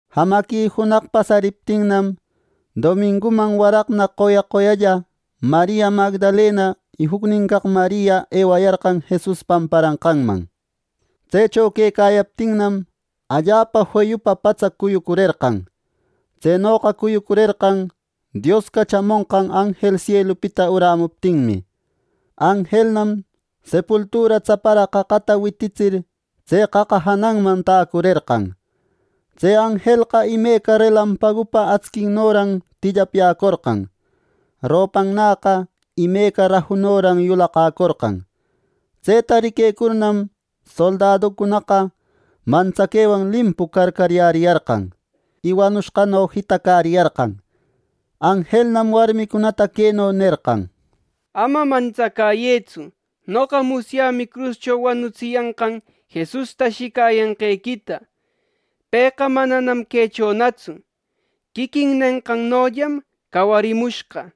Jamaqui junaq pasariptinnam, dominguman waraqna qoya qoyalla Maria Magdalena y juc caq Maria ewayarqan Jesus pamparanqanman. Tsecho quecayaptinnam, allapa feyupa patsa cuyucurerqan. Tsenoqa cuyucurerqan, Dios cachamonqan anjel sielupita urämuptinmi. Anjelnam sepultura tsaparaq qaqata wititsir tse qaqa jananman täcurerqan. Tse anjelqa imeca relampagupa actsinnoran tillapyäcorqan. Ropannäqa imeca rajunoran yulaqäcorqan. Tseta riquecurnam, soldaducunaqa mantsaquewan limpu carcaryäriyarqan, y wanushqano jitacäriyarqan. Anjelnam warmicunata queno nerqan: —Ama mantsacäyëtsu. Noqa musyämi cruscho wanutsiyanqan Jesusta ashicayanqequita. Pëqa mananam quechonatsu. Quiquin nenqannollam cawarimushqa.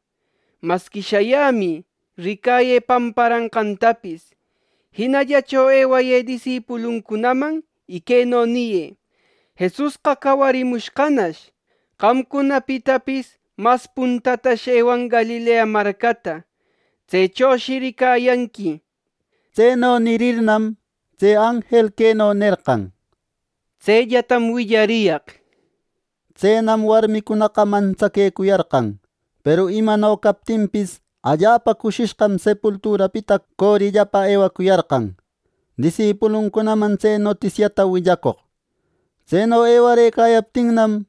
Masqui shayämï, ricayë pamparanqantapis. Jinallacho ewayë disipuluncunaman y queno niyë: ‘Jesusqa cawarimushqanash. Qamcunapitapis mas puntatash ewan Galilea marcata. Tsechoshi ricayanqui’ —nir. Tseno nirirnam, tse anjel queno nerqa: —Tsellatam willariyaq —nir. Tsenam warmicunaqa mantsaquecuyarqan. Peru imano captinpis, allapa cushishqam sepulturapita corillapa ewacuyarqan disipuluncunaman tse notisiata willacoq. Tseno ewarëcayaptinnam,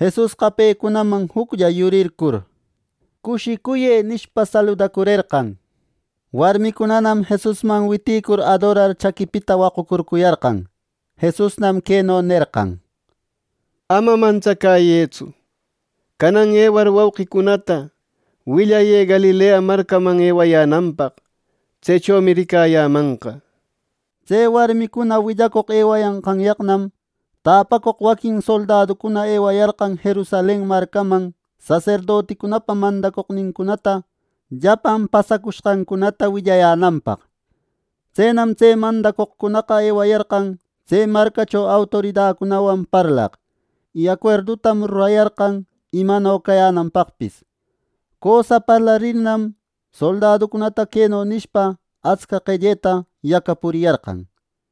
Jesusqa pecunaman juclla yurircur, “Cushicuyë” nishpa, saludacurerqan. Warmicunanam Jesusman witïcur adorar chaquipita waqucurcuyarqan. Jesusnam queno nerqan: —Ama mantsacäyëtsu. Canan ewar wauqicunata, willayë Galilea marcaman ewayänanpaq; tsechomi ricayämanqa —nir. Tse warmicuna willacoq ewayanqanyaqnam, täpacoq waquin soldaducuna ewayarqan Jerusalen marcaman saserdoticunapa mandacoqnincunata, llapan pasacushqancunata willayänanpaq. Tsenam tse mandacoqcunaqa ewayarqan tse marcacho autoridacunawan parlaq, y acuerdutam rurayarqan imano cayänanpaqpis. Cösa parlarirnam, soldaducunata queno nishpa atsca qelleta yacapuriyarqan: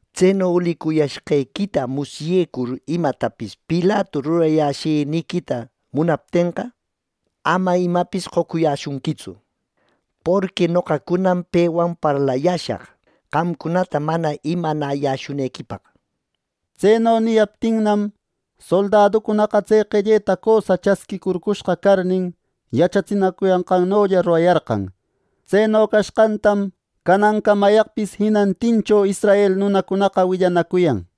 —Tseno ulicuyashqequita musyecur imatapis Pilatu rurayäshiniquita munaptenqa, ama imapis qocuyäshunquitsu, porqui noqacunam pewan parlayäshaq, qamcunata mana imanayäshunequipaq. Tseno niyaptinnam, soldaducunaqa tse qelleta cösa chasquïcurcushqa carnin, yachatsiyanqannolla rurayarqan. Tseno cashqantam canancamayaqpis jinantincho israel nunacunaqa willanacuyan.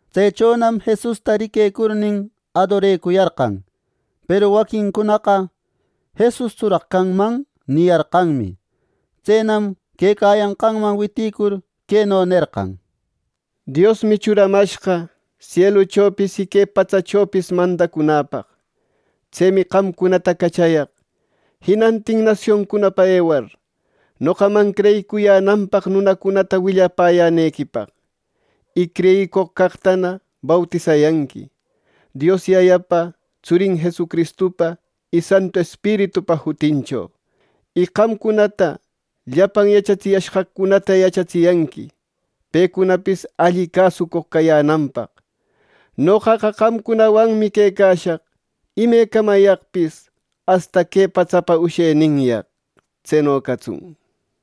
Tsechonam Jesusta riquecurnin, adorecuyarqan; peru waquincaqcunaqa “¿Jesustsuraq canman?” niyarqanmi. Tsenam quecayanqanman witïcur, queno nerqan: —Diosmi churamashqa, sieluchopis y que patsachopis mandacunäpaq. Tsemi qamcunata cachayaq jinantin nasioncunapa ewar, noqaman creyicuyänanpaq nunacunata willapäyänequipaq, y creyicoq caqtana bautisayanqui Dios Yayapa, Tsurin Jesucristupa y Santu Espiritupa jutincho. Y qamcunata llapan yachatsiyashqaqcunata yachatsiyanqui pecunapis alli cäsucoq cayänanpaq. Noqaqa qamcunawanmi quecashaq imecamayaqpis, asta que patsapa usheninyaq. Tseno catsun.